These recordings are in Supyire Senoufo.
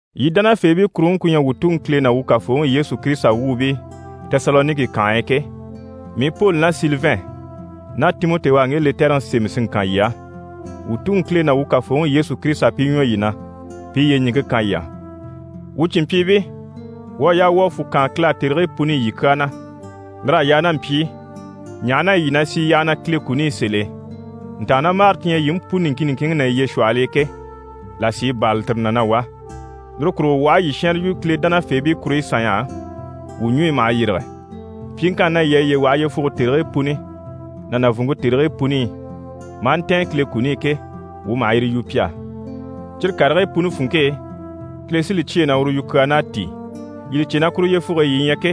Yii dánafeebii kuruŋke ku ɲyɛ wuu Tuŋi Kile ná wuu Kafooŋi Yesu Kirisita wuubii Tesaloniki kànhe e ke, mii Poli ná Silivɛn ná Timɔti u à ŋge lɛtɛrɛŋi sémɛ si ŋkan yii á. Wuu Tuŋi Kile ná wuu Kafooŋi Yesu Kirisita pi ɲwɔ yii na, pi i yyeɲiŋke kan yii á. Wuu cìnmpyiibii, wuu à yaa wuu a fwù kaan Kile á tèrigii puni i yii kyaa na. Lir'à yaa ná mpyi i, ɲaha na yɛ yii na sì yyaha na Kile kuni i sèl'e, ntàannamagare ti ɲyɛ yii mú puni niŋkin niŋkinŋi ná yiye shwɔhɔl'e ke, là sí i bârali tire na na wá. Lire kurugo wuu aha a yii shɛnrɛ yu Kile dánafeebii kuruɲyi sanɲy'á, wuu ɲùɲyi maha yîrige. Pyiŋkanni na yii à yiye waha yyefuge tèrigii puni ná nàvunŋke tèrigii puni i, maa ntɛ̀ɛn Kile kuni i ke, wuu maha yire yu pi á. Cyire karigii puni funŋke e, Kile sí li cyêe na uru yukyaan'à tíi. Yii li cè na kuru yyefuge e yii ɲyɛ ke,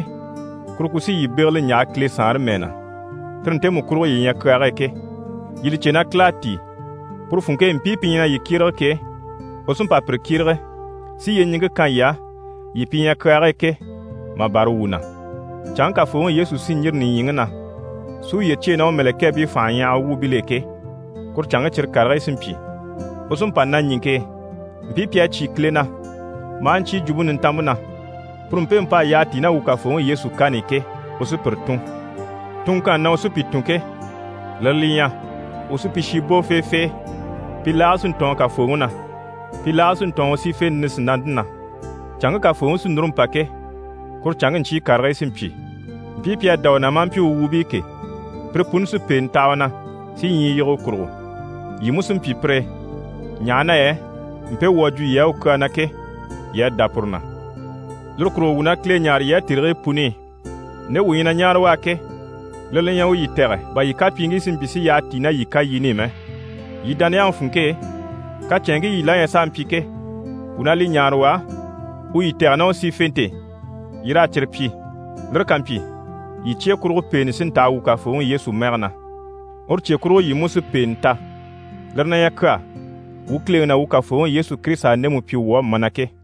kuru ku sí yii bégele n‑yaha Kile Saanre mɛɛ na, tire ntemu kurugo yii ɲyɛ kyaage e ke. Yii li cè na Kile à tíi, puru funŋke e mpii pi ɲyɛ na yii kyérege ke, u sí n‑pa pire kyérege, si yyeɲiŋke kan yii á, yii pi ɲyɛ kyaage e ke, mà bâra wuu na. Canŋke Kafooŋi Yesu sí n‑yîri nìɲyiŋi na si uye cyêe ná u mɛ̀lɛkɛɛbii fànhaɲyahaga wuubil'e ke, kuru canŋke, cyire karigii sí n‑pyi. U sí n‑pa naɲiŋke e, mpii pi à cyé Kile na, maa ɲcyé Jwumpe Nintanmpe na, puru mpemu p'à yyaha tíi ná wuu Kafooŋi Yesu kani i ke, u sí pire tùn. Tunŋkanni na u sí pi tùn ke, lire li ɲyɛ: u sí pi shi bò feefee, pi laage sí n‑tɔɔn Kafooŋi na, pi laage sí n‑tɔɔn u sífente nisinante na. Canŋke Kafooŋi sí núru n‑pa ke, kuru canŋke ɲcyii karigii sí n‑pyi. Mpii pi à dá u na maa mpyi u wuubii ke, pire puni sí pèenɛ taha u na, si ɲyii yige u kurugo. Yii mú sí n‑pyi pire e, ɲaha na yɛ mpe wuu à jwo yii á u kyaa na ke, yii à dá puru na. Lire kurugo wuu na Kile ɲáare yii á tèrigii puni i. Nde wuu ɲyɛ na ɲáare u á ke, lire li ɲyɛ u yii tɛ̀gɛ bà yii kapyiiŋkii si mpyi si yyaha tíi ná yii kayini i mɛ. Yii dániyaŋi funŋke e, kacɛnŋkii yii la ɲyɛ s'a mpyi ke, wuu na li ɲáare u á, u yii tɛ̀gɛ ná u sífente e, yii raa cyire pyi. Lire ká mpyi, yii cye kurugo pèente sí n‑taha wuu Kafooŋi Yesu mɛge na, uru cye kurugo yii mú sí pèenɛ ta. Lire na ɲyɛ kyaa wuu Kileŋi ná wuu Kafooŋi Yesu Kirisita à ndemu pyi wuu á mana ke.